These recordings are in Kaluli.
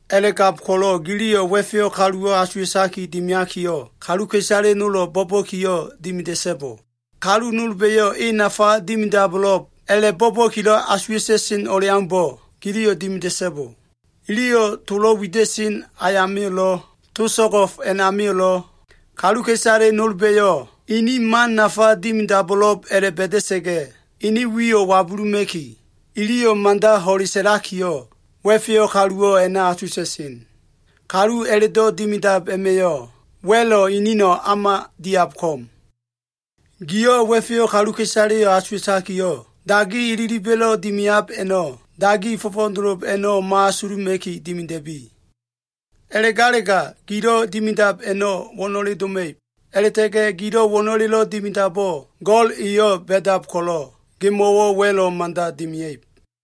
“A꞉la꞉gab ko꞉lo꞉ giliyo꞉ wa꞉feyo꞉ kaluwo꞉ asuwa꞉taki dimiakiyo꞉, kaluka꞉isale nolo꞉ bo꞉ba꞉kiyo꞉ dimida꞉so꞉bo. Kalu nolba꞉yo꞉ e nafa dimidabo꞉lo꞉b a꞉la꞉bo꞉ba꞉kilo꞉ asuwa꞉ta꞉sen o꞉leaumbo꞉ giliyo꞉ dimida꞉so꞉bo. Iliyo꞉ tolo꞉ wida꞉sen ayamio꞉lo꞉, to so꞉go꞉f a꞉namio꞉lo꞉, kaluka꞉isale nolba꞉yo꞉ inin man nafa dimidabo꞉lo꞉b a꞉la꞉ba꞉da꞉sa꞉ga꞉ ene wiyo꞉ wabuluma꞉ki, iliyo꞉ mada ho꞉le sa꞉lakiyo꞉, wa꞉feyo꞉ kaluwo꞉ a꞉na asuwa꞉ta꞉sen. Kalu a꞉la꞉do꞉ dimidab a꞉ma꞉yo꞉, wa꞉lo꞉ inino꞉ o꞉ma diab ko꞉m. Giyo꞉ wa꞉feyo꞉ kaluka꞉isaleyo꞉ asuwa꞉takiyo꞉, dagi ililiba꞉lo꞉ dimiab a꞉no꞉ dagi fo꞉fo꞉dolo a꞉no꞉ mo꞉asuluma꞉ki dimida꞉bi. A꞉la꞉galega, gilo꞉ dimidab a꞉no꞉ wo꞉no꞉le doma꞉ib. A꞉la꞉ta꞉ga꞉ gilo꞉ wo꞉no꞉lelo꞉ dimidabo꞉, Go꞉l eyo꞉ ba꞉dab ko꞉lo꞉, gemo꞉wo꞉ wa꞉lo꞉ mada dimia꞉ib.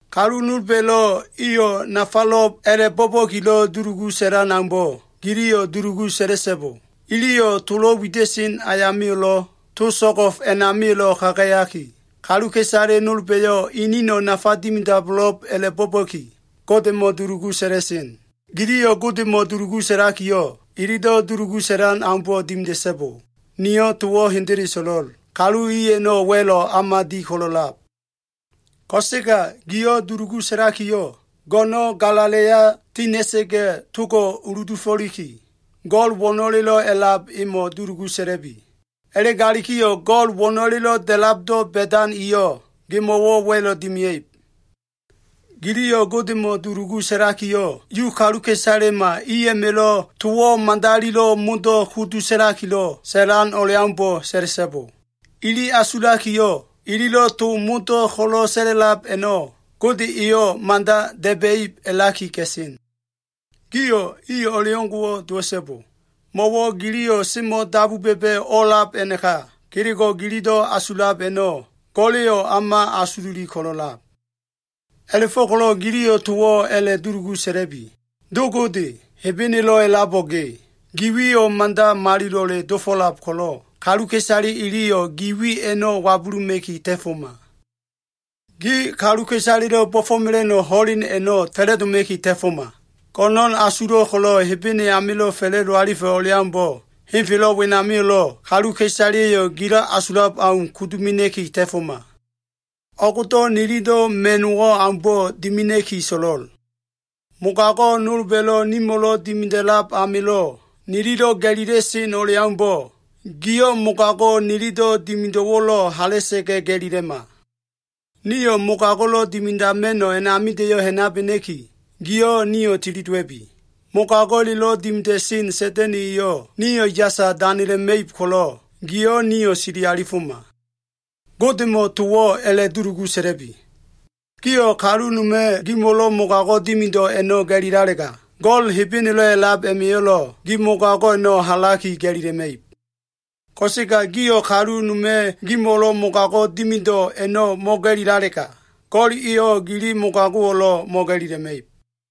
“Kalu nolba꞉lo꞉, iyo꞉ nafalo꞉b a꞉la꞉bo꞉ba꞉kilo꞉ dulugu sa꞉lan aumbo꞉, giliyo꞉ dulugu sa꞉la꞉so꞉bo. Iliyo꞉ tolo꞉ wida꞉sen ayamio꞉lo꞉, to so꞉go꞉f a꞉namio꞉lo꞉ kagayaki, kaluka꞉isale nolba꞉yo꞉ inino꞉ nafa dimidabo꞉lo꞉b a꞉la꞉bo꞉ba꞉ki, Godemo꞉ dulugu sa꞉la꞉sen. Giliyo꞉ Godemo꞉ dulugu sa꞉lakiyo꞉, ililo꞉ dulugu sa꞉lan aumbo꞉ dimida꞉so꞉bo. Niyo꞉ towo꞉ hendele so꞉lo꞉l. Kalu i a꞉no꞉ wa꞉lo꞉ o꞉ma di ko꞉lo꞉lab. Ko꞉sega giyo꞉ dulugu sa꞉lakiyo꞉, go꞉no꞉n galala꞉ya tina꞉ga꞉, togo꞉ uludufo꞉liki, Go꞉l wo꞉no꞉lelo꞉ a꞉lab emo꞉ dulugu sa꞉la꞉bi. A꞉la꞉galikiyo꞉ Go꞉l wo꞉no꞉lelo꞉ da꞉labdo꞉ ba꞉dan eyo꞉ gemo꞉wo꞉ wa꞉lo꞉ dimia꞉ib. “Giliyo꞉ Godemo꞉ dulugu sa꞉lakiyo꞉, Yu kaluka꞉isalema i a꞉ma꞉lo꞉ towo꞉ madalilo꞉ modo꞉ kudu sa꞉la꞉likilo꞉ sa꞉lan o꞉leaumbo꞉ sa꞉la꞉so꞉bo. Ili asulakiyo꞉, ililo꞉ to modo꞉ ko꞉lo꞉ sa꞉la꞉lab a꞉no꞉ Gode eyo꞉ mada da꞉ba꞉ib a꞉laki ga꞉sen. Gio꞉ i o꞉leo꞉ngo꞉wo꞉ dowa꞉so꞉bo. Mo꞉wo꞉ giliyo꞉ o꞉semo꞉ dabu ba꞉ba꞉ o꞉a꞉lab a꞉naka, kelego꞉ gililo꞉ asulab a꞉no꞉ Go꞉la꞉yo꞉ o꞉ma asululi ko꞉lo꞉lab. A꞉la꞉fo꞉ko꞉lo꞉ giliyo꞉ towo꞉ a꞉la꞉dulugu sa꞉la꞉bi. “Do Gode, Hebenelo꞉ a꞉labo꞉ ge, Gi wiyo꞉ mada malilo꞉le dofo꞉lab ko꞉lo꞉ kaluka꞉isale iliyo꞉ gi wi a꞉no꞉ wabuluma꞉ki ta꞉foma. Gi kaluka꞉isalelo꞉ bo꞉fo꞉mela꞉no꞉ ho꞉len a꞉no꞉ fa꞉la꞉doma꞉ki ta꞉foma. Go꞉no꞉n asulo꞉ ko꞉lo꞉ Hebene amilo꞉ fa꞉la꞉do alifa꞉ o꞉leaumbo꞉, henfelo꞉ wenamio꞉lo꞉ kaluka꞉isaleyo꞉ gilo꞉ asulab au kudu mena꞉ki ta꞉foma. O꞉gdo꞉ nililo꞉ ma꞉no꞉wo꞉ aumbo꞉ dimina꞉ki so꞉lo꞉l. Mogago꞉ nolba꞉lo꞉ nimo꞉lo꞉ dimida꞉lab amilo꞉ nililo꞉ ga꞉lila꞉sen o꞉leaumbo꞉, giyo꞉ mogago꞉ nililo꞉ dimido꞉wo꞉lo꞉ hala꞉sa꞉ga꞉ ga꞉lilema. Nio꞉ mogago꞉lo꞉ dimidama꞉no꞉ a꞉namida꞉yo꞉ ha꞉nabena꞉ki, giyo꞉ nio꞉ tili dowa꞉bi. Mogago꞉lelo꞉ dimida꞉sen Sa꞉da꞉na꞉ eyo꞉ nio꞉ yasa danela꞉ma꞉ib ko꞉lo꞉, giyo꞉ nio꞉ sili alifoma. Godemo꞉ towo꞉ a꞉la꞉dulugu sa꞉la꞉bi. “Gio꞉ kalu noma꞉ gemo꞉lo꞉ mogago꞉ dimido꞉ a꞉no꞉ ga꞉lilalega, Go꞉l Hebenelo꞉ a꞉lab a꞉ma꞉yo꞉lo꞉ gi mogago꞉ a꞉no꞉ halaki ga꞉lila꞉ma꞉ib. Ko꞉sega gio꞉ kalu noma꞉ gemo꞉lo꞉ mogago꞉ dimido꞉ a꞉no꞉ mo꞉ga꞉lilalega, Go꞉l eyo꞉ gili mogago꞉wo꞉lo꞉ mo꞉ga꞉lila꞉ma꞉ib.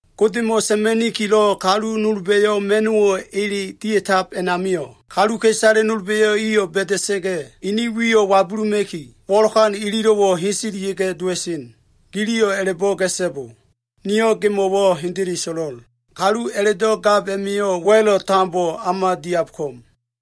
“Godemo꞉ sa꞉ma꞉nikiyo꞉ kalu nolba꞉yo꞉ ma꞉no꞉wo꞉ ele dia꞉tab a꞉namio꞉, kaluka꞉isale nolba꞉yo꞉ iyo꞉ ba꞉da꞉sa꞉ga꞉ ini wiyo꞉ wabuluma꞉ki, wo꞉lokan ililo꞉wo꞉ heselia꞉ga꞉ dowa꞉sen. Giliyo꞉ a꞉la꞉bo꞉ ga꞉so꞉bo. Niyo꞉ gimo꞉wo꞉ hendele so꞉lo꞉l. Kalu a꞉la꞉do꞉ gab a꞉ma꞉yo꞉ wa꞉lo꞉ tambo o꞉ma diab ko꞉m.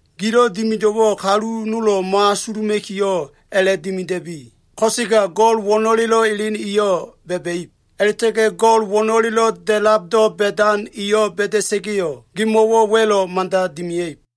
Gilo꞉ dimido꞉wo꞉ kalu nolo꞉ mo꞉asuluma꞉kiyo꞉ a꞉la꞉dimida꞉bi. Ko꞉sega Go꞉l wo꞉no꞉lelo꞉ elen eyo꞉ ba꞉ba꞉ib. A꞉la꞉ta꞉ga꞉ Go꞉l wo꞉no꞉lelo꞉ da꞉labdo꞉ ba꞉dan eyo꞉ ba꞉da꞉sa꞉ga꞉yo꞉, gemo꞉wo꞉ wa꞉lo꞉ mada dimia꞉ib.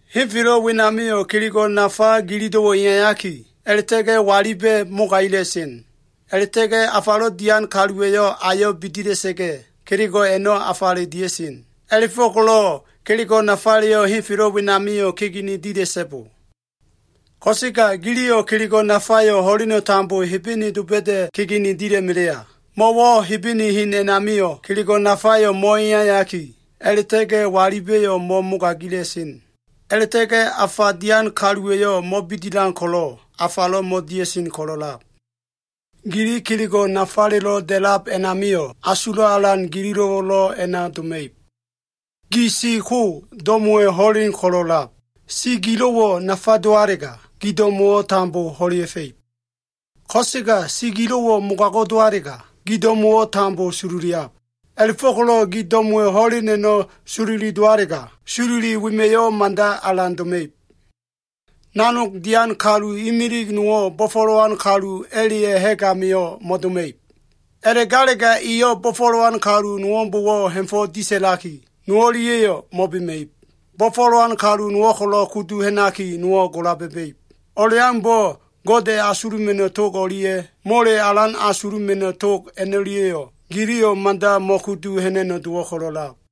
“Henfelo꞉ wenamio꞉ kelego꞉ nafa gililo꞉wo꞉ eyayaki, a꞉la꞉ta꞉ga꞉ waliba꞉ mogaila꞉sen. A꞉la꞉ta꞉ga꞉ afalo꞉ dian kaluwa꞉yo꞉ ayo꞉ bidila꞉sa꞉ga꞉, kelego꞉ a꞉no꞉ afale dia꞉sen. A꞉la꞉fo꞉ko꞉lo꞉ kelego꞉ nafaleyo꞉ henfelo꞉ wenamio꞉ kegene dila꞉so꞉bo. Ko꞉sega giliyo꞉ kelego꞉ nafayo꞉ ho꞉leno꞉ tambo Hebene doba꞉da꞉ kegene dila꞉ melea. Mo꞉wo꞉ Hebene hen a꞉namio꞉ kelego꞉ nafayo꞉ mo꞉eyayaki, a꞉la꞉ta꞉ga꞉ waliba꞉yo꞉ mo꞉mogaila꞉sen. A꞉la꞉ta꞉ga꞉ afa dian kaluwa꞉yo꞉ mo꞉bidilan ko꞉lo꞉ afalo꞉ mo꞉dia꞉sen ko꞉lo꞉lab. Gili kelego꞉ nafalelo꞉ da꞉lab a꞉namio꞉, asulo꞉ alan gililo꞉wo꞉lo꞉ a꞉na doma꞉ib. “Gi siko, do꞉mo꞉wa꞉ ho꞉len ko꞉lo꞉lab. Si gilo꞉wo꞉ nafa dowalega, gi do꞉mo꞉wo꞉ tambo ho꞉lea꞉fa꞉ib. Ko꞉sega si gilo꞉wo꞉ mogago꞉ dowalega, gi do꞉mo꞉wo꞉ tambo sololiab. A꞉la꞉fo꞉ko꞉lo꞉ gi do꞉mo꞉wa꞉ ho꞉len a꞉no꞉ sololi dowalega, sololi wema꞉yo꞉ mada alan doma꞉ib. “Nanog dian kalu imili nowo꞉ bo꞉fo꞉lowan kalu a꞉la꞉ya꞉ ha꞉g amio꞉ mo꞉doma꞉ib. A꞉la꞉galega, eyo꞉ bo꞉fo꞉lowan kalu nowo꞉mbo꞉wo꞉ ha꞉fo꞉ disa꞉laki, no o꞉lia꞉yo꞉ mo꞉bema꞉ib. Bo꞉fo꞉lowan kalu nowo꞉ ko꞉lo꞉ kudu ha꞉naki, nowo꞉ gola ba꞉ba꞉ib. O꞉leaumbo꞉ Gode asuluma꞉no꞉ tog o꞉lia꞉ mole alan asuluma꞉no꞉ tog a꞉no꞉lia꞉yo꞉ giliyo꞉ mada mo꞉kudu ha꞉na꞉no꞉ dowo꞉ ko꞉lo꞉lab.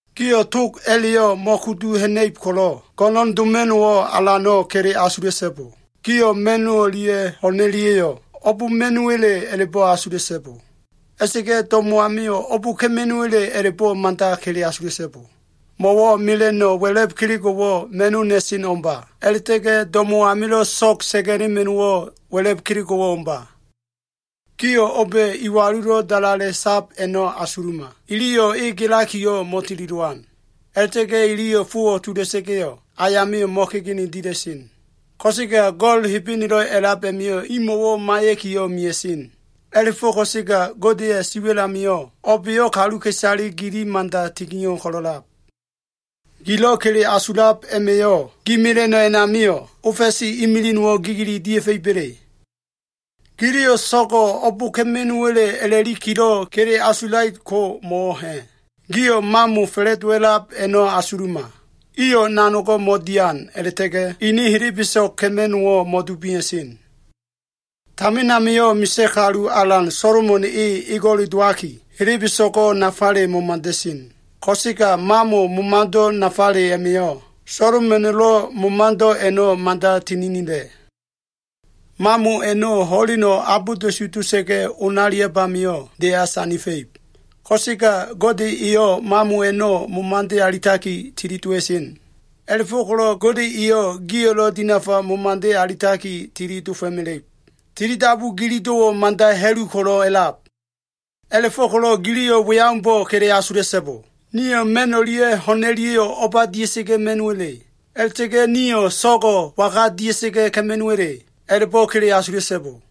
“Gio꞉ tog a꞉la꞉yo꞉ mo꞉kudu ha꞉na꞉ib ko꞉lo꞉, go꞉no꞉n doma꞉no꞉wo꞉ alano꞉ kele asula꞉so꞉bo. Gio꞉ ma꞉no꞉ o꞉lia꞉ ho꞉n o꞉lia꞉yo꞉ o꞉b ma꞉no꞉wa꞉le a꞉la꞉bo꞉ asula꞉so꞉bo. A꞉la꞉ta꞉ga꞉ do꞉mo꞉ amio꞉ o꞉b ka꞉ma꞉no꞉wa꞉le a꞉la꞉bo꞉ mada kele asula꞉so꞉bo. Mo꞉wo꞉ Mela꞉no꞉ wa꞉la꞉b kelego꞉wo꞉ ma꞉no꞉ na꞉seno꞉ ko꞉mba. A꞉la꞉ta꞉ga꞉ do꞉mo꞉ amilo꞉ so꞉g sa꞉ga꞉lema꞉no꞉wo꞉ wa꞉la꞉b kelego꞉wo꞉ o꞉mba. Gio꞉ o꞉ba꞉ iwalulo꞉ dalale sab a꞉no꞉ asuluma! Iliyo꞉ e gelakiyo꞉ mo꞉tili dowan. A꞉la꞉ta꞉ga꞉ iliyo꞉ fowo꞉ tula꞉sa꞉ga꞉yo꞉ ayamio꞉ mo꞉kegene dila꞉sen. Ko꞉sega Go꞉l Hebenelo꞉ a꞉lab a꞉ma꞉yo꞉ imo꞉wo꞉ maiya꞉kiyo꞉ mea꞉sen. A꞉la꞉fo꞉ ko꞉sega Godeya꞉ siwa꞉l amio꞉ o꞉ba꞉yo꞉ kaluka꞉isale gili mada tinio꞉ ko꞉lo꞉lab. Gilo꞉ kele asulab a꞉ma꞉yo꞉, gi mela꞉no꞉ a꞉namio꞉ ofa꞉si imilig nowo꞉ gigili dia꞉fa꞉iba꞉le? Giliyo꞉ so꞉go꞉ o꞉b ka꞉ma꞉no꞉wa꞉le a꞉la꞉likilo꞉ kele asulait ko mo꞉wo꞉ ha꞉? Gio꞉ mamo fa꞉la꞉dowa꞉lab a꞉no꞉ asuluma! Iyo꞉ nanogo꞉ mo꞉dian, a꞉la꞉ta꞉ga꞉ ene helebeso꞉g ka꞉ma꞉no꞉wo꞉lo꞉ mo꞉dubia꞉sen. Tamin amio꞉ misa꞉ kalu alan Solomon e ego꞉le dowaki, helebeso꞉go꞉ nafale momada꞉sen. Ko꞉sega mamo momado꞉ nafale a꞉ma꞉yo꞉, Solomona꞉lo꞉ momado꞉ a꞉no꞉ mada tininila꞉. Mamo a꞉no꞉ ho꞉leno꞉ abolda꞉su dota꞉ga꞉ onaliab amio꞉, deya sandifa꞉ib. Ko꞉sega Gode eyo꞉ mamo a꞉no꞉ momade alitaki tili dowa꞉sen. A꞉la꞉fo꞉ko꞉lo꞉ Gode eyo꞉ gio꞉lo꞉ dinafa momade alitaki tili dofo꞉mela꞉ib. Tilidabu gililo꞉wo꞉ mada ha꞉lu ko꞉lo꞉ a꞉lab. A꞉la꞉fo꞉ko꞉lo꞉ giliyo꞉ we aumbo꞉ kele asula꞉so꞉bo. ‘Nio꞉ ma꞉n o꞉lia꞉ ho꞉n o꞉lia꞉yo꞉ o꞉ba dia꞉sa꞉ga꞉ ma꞉no꞉wa꞉le? A꞉la꞉ta꞉ga꞉ nio꞉ so꞉go꞉ waga dia꞉ga꞉ ka꞉ma꞉no꞉wa꞉le?’ A꞉la꞉bo꞉ kele asula꞉so꞉bo.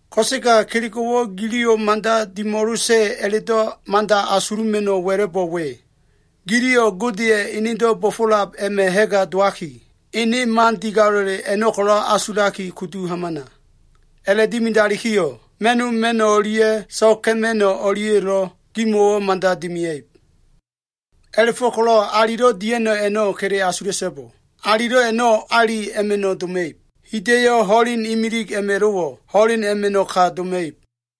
Ko꞉sega kelego꞉wo꞉ giliyo꞉ mada dimo꞉losa꞉ a꞉la꞉do꞉ mada asula꞉ma꞉no꞉ wa꞉la꞉bo꞉ we. Giliyo꞉ Godeya꞉ enedo꞉ bo꞉fo꞉lab a꞉ma꞉ ha꞉ga dowaki, ene man digalo꞉le a꞉no꞉ ko꞉lo꞉ asulaki kudu hamana. A꞉la꞉dimidalikiyo꞉ ma꞉no꞉ ma꞉no꞉ o꞉lia꞉ so꞉g ka꞉ma꞉no꞉ o꞉lia꞉yo꞉lo꞉ gimo꞉wo꞉ mada dimia꞉ib. “A꞉la꞉fo꞉ko꞉lo꞉ alilo꞉ dia꞉no꞉ a꞉no꞉ kele asula꞉so꞉bo. Alilo꞉ a꞉no꞉, ali a꞉ma꞉no꞉ doma꞉ib. Hida꞉yo꞉ ho꞉len imilig a꞉ma꞉lo꞉wo꞉, ho꞉len a꞉ma꞉no꞉ ka doma꞉ib.”